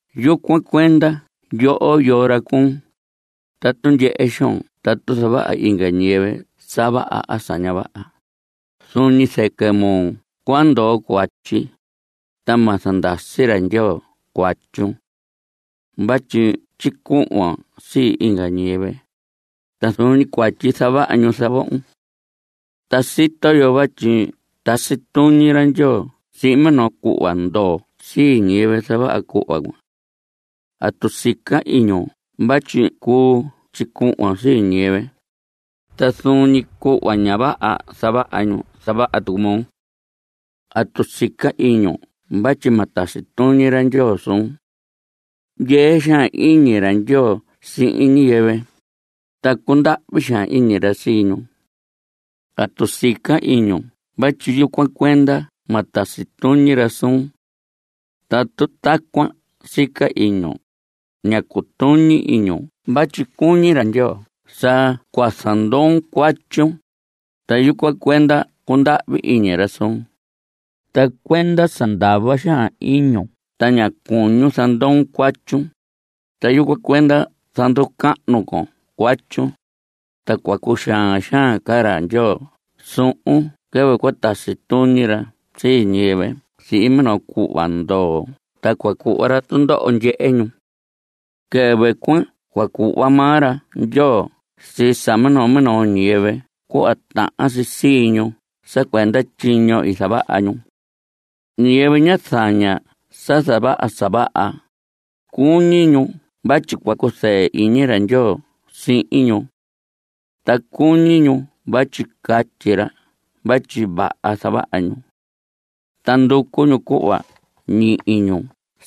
Yucuan cuenda yoho, yoo ra cuun, tatu ndyehe xoon tatu zavaha inga ñiyɨvɨ sa vaha a sa ña vaha, zuun ñi zɨquɨ moo cua ndoo cuatyi, ta ma zandasi ra Ndyoo cuatyun. Vatyi tyicuhvon sii inga ñiyɨvɨ, ta zuun ñi cuatyi zavaha ñu, zavohon. Ta sito yo vatyi tasi tuñi ra Ndyoo sihin minoo cuhva ndoo sii ñiyɨvɨ zavaha cuhva cuan. ¿Atu sica iñun vatyi cuu tyicuhvon sii ñiyɨvɨ? Ta zuun ñi cuhva ña vaha zavaha ñu zavaha tucu moo. ¿Atu sica iñun vatyi ma tasi tuñi ra Ndyoo suun? Ndyee xaan iñi ra Ndyoo sihin ñiyɨvɨ, ta cundahvi xaan iñi ra sii ñu. ¿Atu sica iñun vatyi yucuan cuenda ma tasi tuñi ra suun? Tatu tacuan sica iñun, ña cutuñi iñun vatyi cuñi ra Ndyoo sa cua zandoon cuatyun, ta yucuan cuenda cundahvi iñi ra suun. Ta cuenda sa ndava xaan iñun ta ña cuñun zandoon cuatyun, ta yucuan cuenda zanducahnu con cuatyun, ta cua cuxaan xaan ra Ndyoo suhun quɨvɨ cua tasi tuñi ra sii ñiyɨvɨ sihin minoo cuhva ndoo ta cua cuhva ra tundoho ndyehe ñu. Quɨvɨ cuan cua cuhva maa ra Ndyoo sii sa minoo minoo ñiyɨvɨ cuhva tahan si sii ñu sa cuenda tyiño i zavaha ñu. Ñiyɨvɨ ña zaña sa zavaha sa vaha, cuñi ñu vatyi cua cuzɨɨ iñi ra Ndyoo sihin ñu. Ta cuñi ñu vatyi catyi ra vatyi vaha zavaha ñu. Ta nducu ñu cuhva ñihi ñu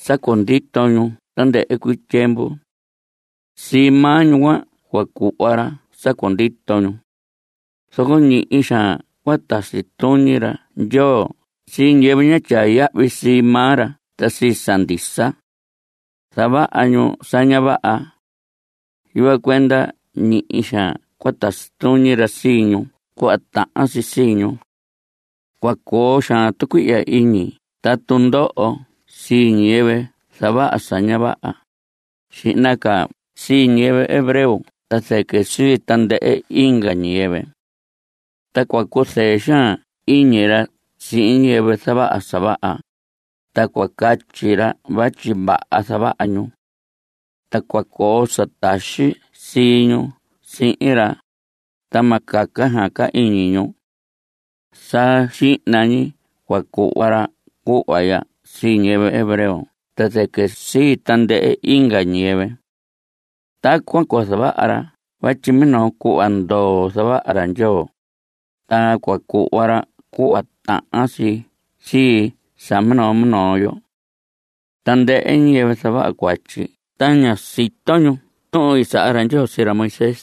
sa cundito ñu tandɨhɨ cuii tyiemvu. Sii maa ñu cuan cua cuhva ra sa cundito ñu. Zoco ñihi xaan cua tasi tuñi ra Ndyoo sii ñiyɨvɨ ña tyaa yahvi sii maa ra ta sii sa ndisa. Zavaha ñu sa ña vaha. Yucuan cuenda ñihi xaan cua tasi tuñi ra sii ñu cuhva tahan si sii ñu. Cua coo xaan tucuihya iñi ta tundoho sii ñiyɨvɨ zavaha sa ña vaha, xihna ca sii ñiyɨvɨ hebreo ta zɨquɨ sii tandɨhɨ inga ñiyɨvɨ. Ta cua cuzɨɨ xaan iñi ra sihin ñiyɨvɨ zavaha sa vaha, ta cua catyi ra vatyi vaha zavaha ñu. Ta cua coo sa taxi ñi sii ñu sihin ra, ta ma caca xaan ca iñi ñu. Sa xihna ñi cua cuhva ra cuhva ya sii ñiyɨvɨ hebreo ta zɨquɨ sii tandɨhɨ inga ñiyɨvɨ. Tacuan cua zavaha ra vatyi minoo cuhva ndoo zavaha ra Ndyoo, ta cua cuhva ra cuhva tahan si sii sa minoo minoo yo. Tandɨhɨ ñiyɨvɨ zavaha cuatyi ta ña sito ñu tuhun i saha ra Ndyoo sii ra Moisés,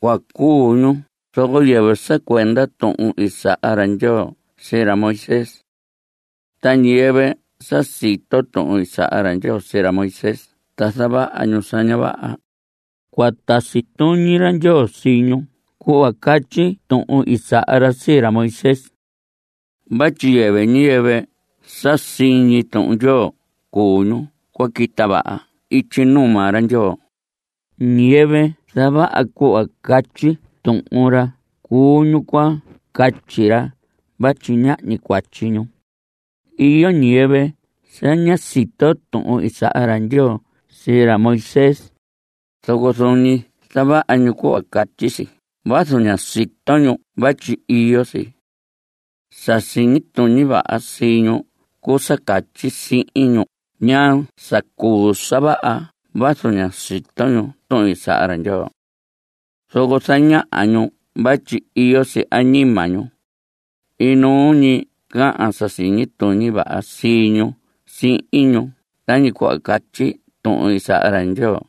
cua cuu ñu zoco yɨvɨ sa cuenda tuhun i saha ra Ndyoo sii ra Moisés. Ta ñiyɨvɨ sa sito tuhun i saha ra Ndyoo sii ra Moisés ta zavaha ñu sa ña vaha, cua tasi tuñi ra Ndyoo sii ñu cuhva catyi tuhun i saha ra sii ra Moisés. Vatyi yɨvɨ ñiyɨvɨ sa siñi ñi Tuhun Ndyoo cuu ñu cua quita vaha ityi nuu maa ra. Ñiyɨvɨ zavaha cuhva catyi Tuhun ra cuu ñu cua catyi ra vatyi ñahñi cuatyi ñu. Iyo ñiyɨvɨ sa ña sito tuhun i saha ra Ndyoo sii ra Moisés, zoco zuun ñi zavaha ñu cuhva catyi si vazu ña sito ñu vatyi iyo si. Sa siñi tuñi vaha sii ñu cuu sa catyi sihin ñu ñaa sa cuu sa vaha vazu ña sito ñu tuhun i saha ra Ndyoo. Zoco zañaha ñu vatyi iyo si añima ñu. Inuu ñi cahan sa siñi tuñi vaha sii ñu sihin ñu tañi cuhva catyi Tuhun i saha ra Ndyoo.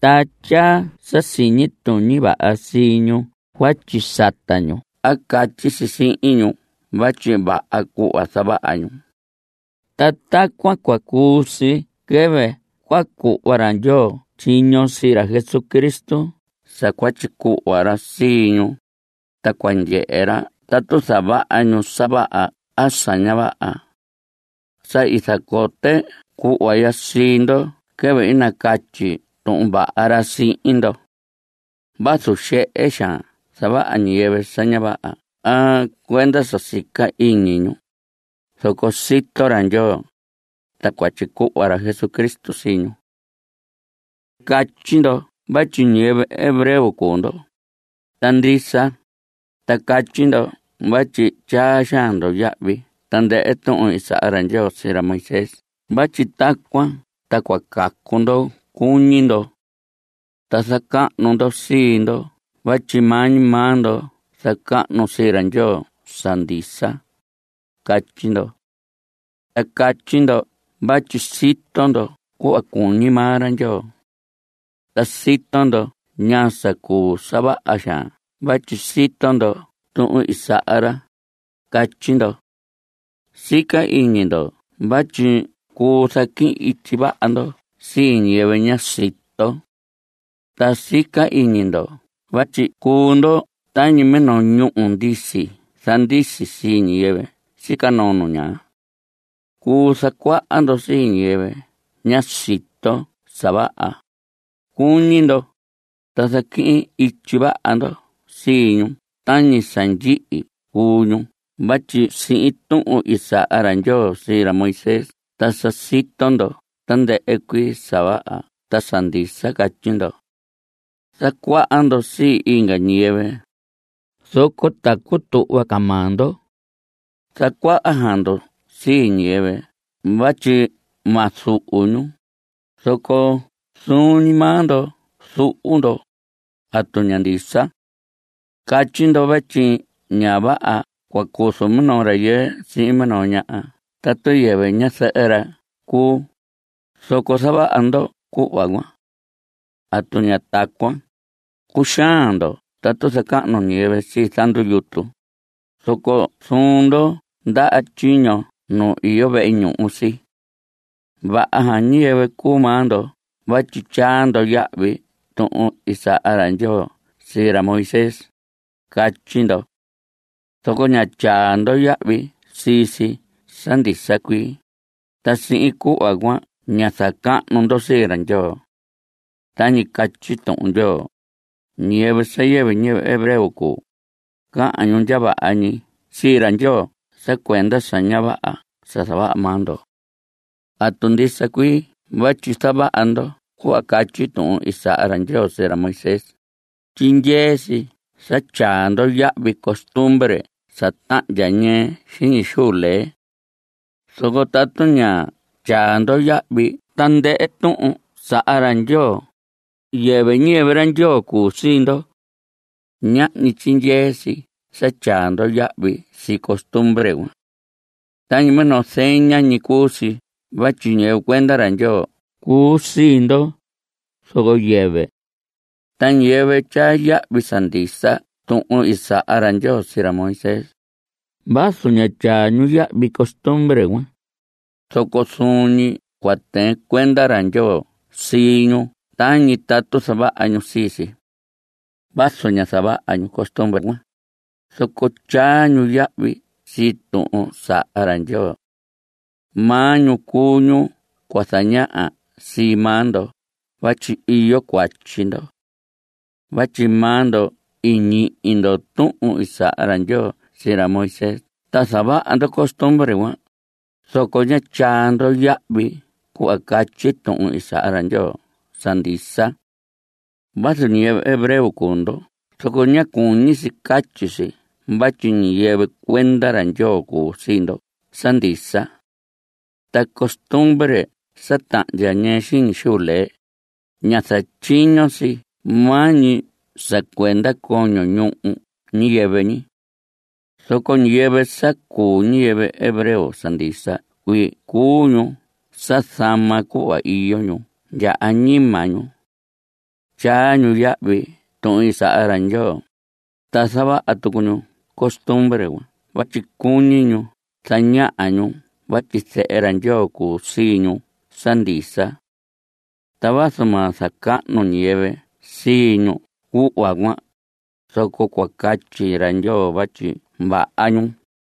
Ta tyaa sa siñi tuñi vaha sii ñu cuatyi sata ñu a catyi si sihin ñu vatyi vaha cuu cuhva zavaha ñu. Ta tacuan cua cuu si quɨvɨ cua cuhva ra Ndyoo tyiño sii ra Jesucristo sa cua tyicuhva ra sii ñu, ta cua ndyehe ra tatu zavaha ñu sa vaha a sa ña vaha. Sa i zacote cuhva ya sii ndo quɨvɨ i nacatyi Tuhun Vaha ra sihin ndo. Vazu xehe xaan zavaha ñiyɨvɨ sa ña vaha a cuenda sa sica ñi iñi ñu, zoco sito ra Ndyoo, ta cua tyicuhva ra Jesucristo sii ñu. Catyi ndo vatyi ñiyɨvɨ hebreo cuu ndo. Ta ndisa. Ta catyi ndo vatyi tyaa xaan ndo yahvi tandɨhɨ tuhun i saha ra Ndyoo sii ra Moisés vatyi tacuan ta cua cacu ndo cuñi ndo. Ta zacahnu ndo sii ndo vatyi maa ñi maa ndo zacahnu sii ra Ndyoo sa ndisa, catyi ndo. Ta catyi ndo vatyi sito ndo cuhva cuñi maa ra. Ta sito ndo ñaa sa cuu sa vaha xaan vatyi sito ndo tuhun i saha ra. Catyi ndo. Sica iñi ndo vatyi cuu zaquihin ityi vaha ndo sii ñiyɨvɨ ña sito. Ta sica iñi ndo vatyi cuu ndo tañi minoo ñúhu ndisi zandisi sii ñiyɨvɨ sica noo nu ñaa. Cuu zacuaha ndo sii ñiyɨvɨ ña sito sa vaha, cuñi ndo, ta zaquihin ityi vaha ndo sii ñu tañi sa ndyihi cuu ñu vatyi sihin tuhun i saha ra Ndyoo sii ra Moisés ta sa sito ndo tandɨhɨ cuii sa vaha ta sa ndisa, catyi ndo. Zacuaha ndo sii inga ñiyɨvɨ, zoco ta cutuhva ca maa ndo. Zacuaha xaan ndo sii ñiyɨvɨ vatyi ma zuhu ñu, zoco zuun ñi maa ndo zuhu ndo. ¿Atu ña ndisa? Catyi ndo vatyi ña vaha cua cuzu minoo rayɨɨ sihin minoo ñaha tatu yɨvɨ ñazɨhɨ ra cuu, zoco zavaha ndo cuhva cuan. ¿Atu ña tacuan? Cuxaan ndo tatu zacahnu ñiyɨvɨ zandu yutu, zoco zuhu ndo ndaha tyiño nu iyo vehe ñuhu si. Vaha xaan ñiyɨvɨ cuu maa ndo vatyi tyaa ndo yahvi tuhun i saha ra Ndyoo sii ra Moisés, catyi ndo. Zoco ña tyaa ndo yahvi sii si sa ndisa cuii, ta sihin cuhva cuan ña zacahnu ndo sii ra Ndyoo. Tañi catyi Tuhun Ndyoo: “Ñiyɨvɨ sa yɨvɨ ñiyɨvɨ hebreo cuu, cahan ñu ndya vaha ñi sii ra Ndyoo sa cuenda sa ña vaha sa zavaha maa ndo.” Tatu ndisa cuii vatyi zavaha ndo cuhva catyi tuhun i saha ra Ndyoo sii ra Moisés, tyindyee si sa tyaa ndo yahvi costumbre sa tahndya ñɨɨ xiñi xuu lee. Zoco tatu ña tyaa ndo yahvi tandɨhɨ tuhun i saha ra Ndyoo, yɨvɨ ñiyɨvɨ ra cuu sii ndo. Ñahñi tyindyee si sa tyaa ndo yahvi sii costumbre cuan. Tañi minoo zeña ñi cuu si vatyi ñiyɨvɨ cuenda ra Ndyoo cuu sii ndo, zoco yɨvɨ. Ta ñiyɨvɨ tyaa yahvi sa ndisa tuhun i saha ra Ndyoo sii ra Moisés, vazu ña tyaa ñu yahvi costumbre cuan, zoco zuun ñi cua tɨɨn cuenda ra Ndyoo sii ñu tañi tatu zavaha ñu sii si. Vazu ña zavaha ñu costumbre cuan, zoco tyaa ñu yahvi sii tuhun i saha ra Ndyoo. Maa ñu cuu ñu cua zañaha sii maa ndo vatyi iyo cuatyi ndo. Vatyi maa ndo i ñihi ndo tuhun i saha ra Ndyoo sii ra Moisés ta zavaha ndo costumbre cuan, zoco ña tyaa ndo yahvi cuhva catyi tuhun i saha ra Ndyoo sa ndisa. Vazu ñiyɨvɨ hebreo cuu ndo zoco ña cuñi si catyi si vatyi ñiyɨvɨ cuenda ra Ndyoo cuu sii ndo sa ndisa. Ta costumbre sa tahndya ñɨɨ xiñi xuu lee, ña zatyiño si maa ñi sa cuenda coño ñuhu ñiyɨvɨ. Zoco ñiyɨvɨ sa cuu ñiyɨvɨ hebreo sa ndisa cuii cuu ñu sa zama cuhva iyo ñu ndya añima ñu. Tyaa ñu yahvi tuhun i saha ra Ndyoo, ta zavaha tucu ñu costumbre cuan vatyi cuñi ñu zañaha ñu vatyi zehe ra Ndyoo cuu sii ñu sa ndisa. Ta vazu ma zacahnu ñiyɨvɨ sii ñu cuhva cuan, zoco cua catyi ra Ndyoo vatyi vaha ñu.